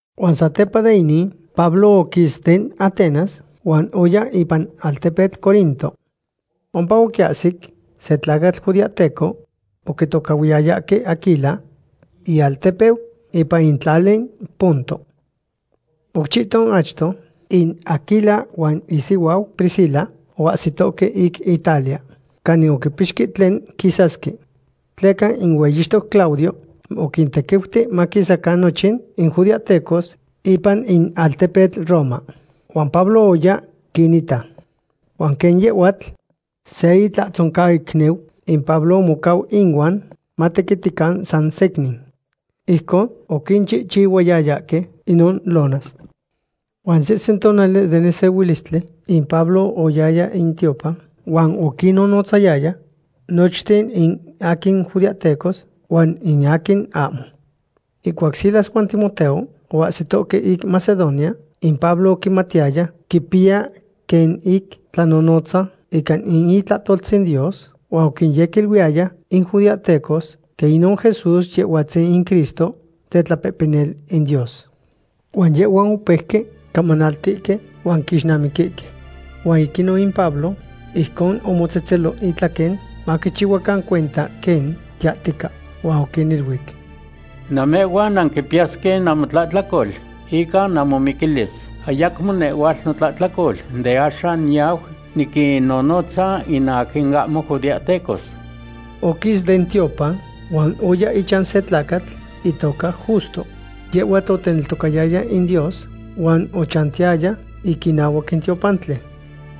Huan satepa de inin, Pablo oquis den Atenas huan oya ipan altepetl Corinto. Ompa oquiahsic se tlacatl judeahteco oquitocahhuiyayahque Aquila, ialtepeu ipan in tlali Ponto. Oc chihton achto in Aquila huan isihuau Priscila oahsitohque ic Italia, canin oquipixque tlen quisasque. Tleca in hueyixtoc Claudio oquintequiuti maquisacan nochin in judeahtecos ipan in altepetl Roma. Huan Pablo oya quinita. Huan quen yehhuatl se itlatzoncaicniu, in Pablo omocau inuan matequitican san secnin. Ijcon oquinchihchihuayayahque inon lonas. Huan sehsen tonali den nesehuilistli in Pablo oyaya in tiopan huan oquinnonotzayaya nochten in aquin judeahtecos huan in aquin ahmo. Ihcuac Silas huan Timoteo oahsitohque ic Macedonia, in Pablo oquimatiyaya quipiya quen ic tlanonotza ica in itlahtoltzin Dios huan oquinyequiluiyaya in judeahtecos quen inon Jesús Yehhuatzin in Cristo, tetlapehpenil in Dios. Huan yehhuan opeuque camanaltihque huan quixnamiquihque. Huan ic inon in Pablo ijcon omotzetzelo itlaquen, maquichihuacan cuenta quen yahtica. Huan oquiniluic: ―Namehhuan nanquipiyasque namotlahtlacol ica namomiquilis. Ayacmo nehhuatl notlahtlacol. De axan niyau niquinnonotza in aquin ahmo judeahtecos. Oquis den tiopan huan oya ichan se tlacatl itoca Justo. Yehhuatl oteneltocayaya in Dios huan ochantiyaya ic inahuac in tiopantli.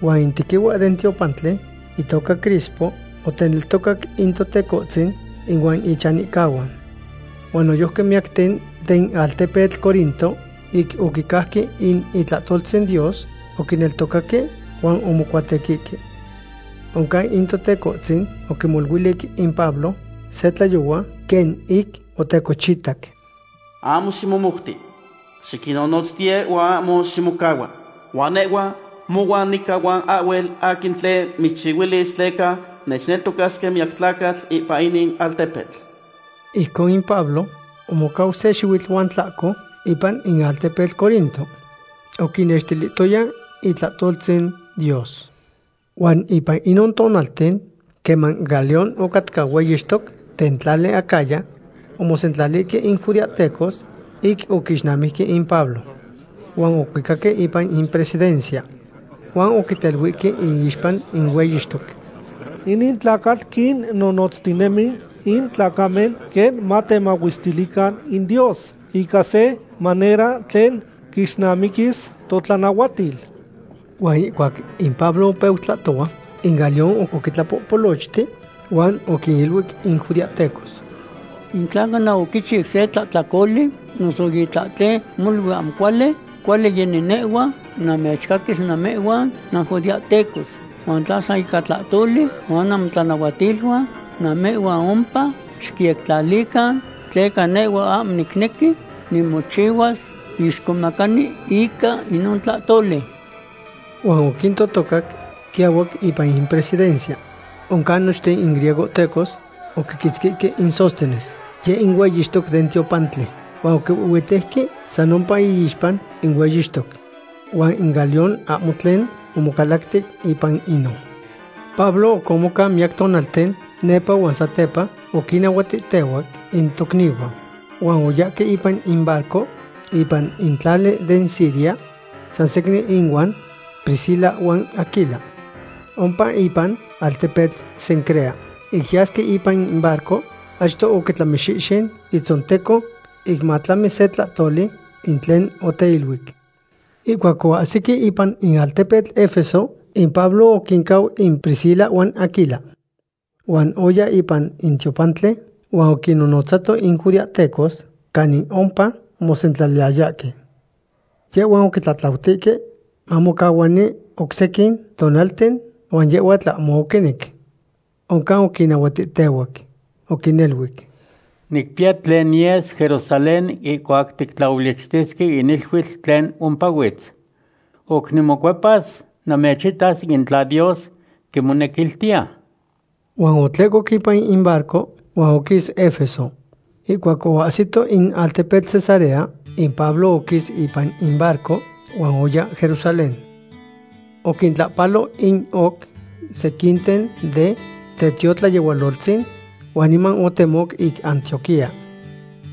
Huan in tequihua den tiopantli, itoca Crispo, oteneltocac in Totecohtzin ihuan ichanihcahuan. Huan noyojqui miyacten den altepetl Corinto, ic oquicajque in itlahtoltzin Dios, oquineltocaque huan omocuatequihque. Oncan in Totecohtzin oquimoluilic in Pablo se tlayohua quen ic otecochitac: ―Ahmo ximomouti. Xiquinnonotztiye huan ahmo ximocahua. Huan nehhua mohuan nica huan ahhuel aquin tlen mitzchihuilis tleca nechneltocasque miyac tlacatl ipan inin altepetl. Ijcon in Pablo omocau se xihuitl huan tlahco ipan in altepetl Corinto. Oquinnextilihtoya itlahtoltzin Dios. Huan ipan inon tonalten, queman Galión ocatca hueyixtoc den tlali Acaya, omosentlalihque in judeahtecos ic oquixnamijque in Pablo. Huan ocuicaque ipan in presidencia. Huan oquiteluihque iixpa in hueyixtoc: ―Inin tlacatl quinnonotztinemi in tlacamen quen matemahuestilican in Dios ica se manera tlen quixnamiquis totlanahuatil. Huan ihcuac in Pablo opeu tlahtohua, in Galión oquitlapopolochti huan oquiniluic in judeahtecos: ―In tla cana oquichiu se tlahtlacoli noso itlahten molui ahmo cuali, cuali yeni nehhua namechcaquis namehhuan nanjudeahtecos. Huan tla san ica tlahtoli huan namotlanahuatiluan, namehhuan ompa xicyectlalican, tleca nehhua ahmo nicnequi nimochihuas tlixcomacani ica inon tlahtoli. Huan oquintotocac quiahuac ipan in presidencia. Oncan nochten in griegohtecos oquiquitzquihque in Sóstenes, yeh in hueyixtoc den tiopantli, huan oquihuihhuitejque san ompa iixpa in hueyixtoc. Huan in Galión ahmo tlen omocalacti ipan inon. Pablo oc omocau miyac tonalten nepa huan satepa oquinnahuatihtehuac in tocnihuan. Huan oyahque ipan in barco ipan in tlali den Siria, sansecnin inuan Priscila huan Aquila. Ompa ipan altepetl Cencrea, ic yasque ipan in barco, achto oquitlamixihxin itzonteco ic matlami se tlahtoli in tlen oteiluic. Ihcuac oahsique ipan in altepetl Efeso, in Pablo oquincau in Priscila huan Aquila. Huan oya ipan in tiopantli huan oquinnonotzato in judeahtecos canin ompa omosentlaliyayahque. Yehhuan oquitlatlautihque mamocahuani oc sequin tonalten, huan yehhuatl ahmo oquinec. Oncan oquinnahuatihtehuac. Oquiniluic: ―Nicpiya tlen niyes Jerusalén ihcuac tictlaolichtisque in iluitl tlen ompahuitz. Oc nimocuepas namechitas in tla Dios quimonequiltiya. Huan otlehcoc ipan in barco huan oquis Efeso. Ihcuac oahsito in altepetl Cesarea, in Pablo oquis ipan in barco huan oya Jerusalén. Oquintlahpalo in oc sequinten den tiotlayehualoltzin huan niman otemoc ic Antioquía.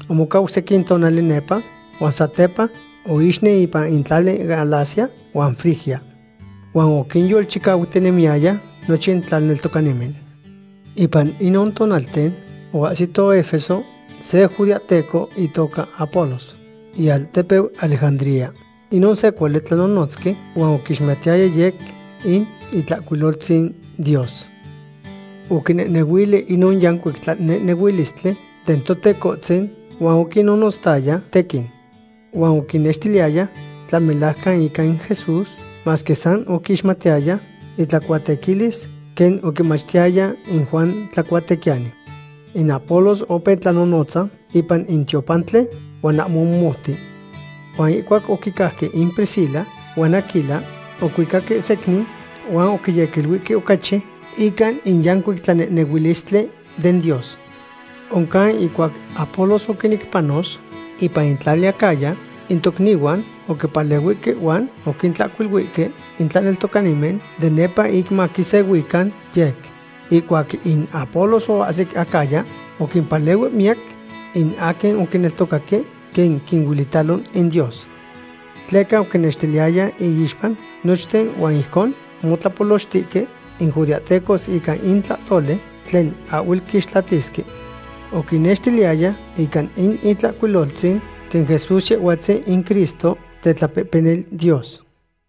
Omocau sequin tonali nepa huan satepa oixnen ipan in tlali Galacia huan Frigia. Huan oquinyolchicautinemiyaya nochin tlaneltocanimen. Ipan inon tonalten oahsihto Efeso se judeahteco itoca Apolos, ialtepeu Alejandría. Inon se cuali tlanonotzqui huan oquixmatiyaya yec in Itlahcuiloltzin Dios. Oquinehnehuili inon yancuic tlanehnehuilistli den Totecohtzin huan oquinnonotzayaya tequin. Huan oquinnextiliyaya tlamelajcan ica in Jesús, masque san oquixmatiyaya itlacuatequilis quen oquimachtiyaya in Juan Tlacuatequiyani. In Apolos opeu tlanonotza ipan in tiopantli huan ahmo omomouti. Huan ihcuac oquicajque in Priscila huan Aquila, ocuicaque secnin huan oquiyequiluihque ocachi ica in yancuic tlanehnehuilistli den Dios. Oncan ihcuac Apolos oquinec panos ipan in tlali Acaya, in tocnihuan oquipalehuihque huan oquintlahcuiluihque in tlaneltocanimen de nepa ic maquisehuican yec. Ihcuac in Apolos oahsic Acaya oquimpalehui miyac in aquin oquineltocaque, quen quinuelitalo in Dios. Tleca oquinextiliyaya iixpa nochten huan ijcon omotlapolochtihque in judeahtecos ica in tlahtoli tlen ahhuel quixtlatisque. Oquinnextiliyaya ica in Itlahcuiloltzin quen Jesús Yehhuatzin in Cristo, tetlapehpenil Dios.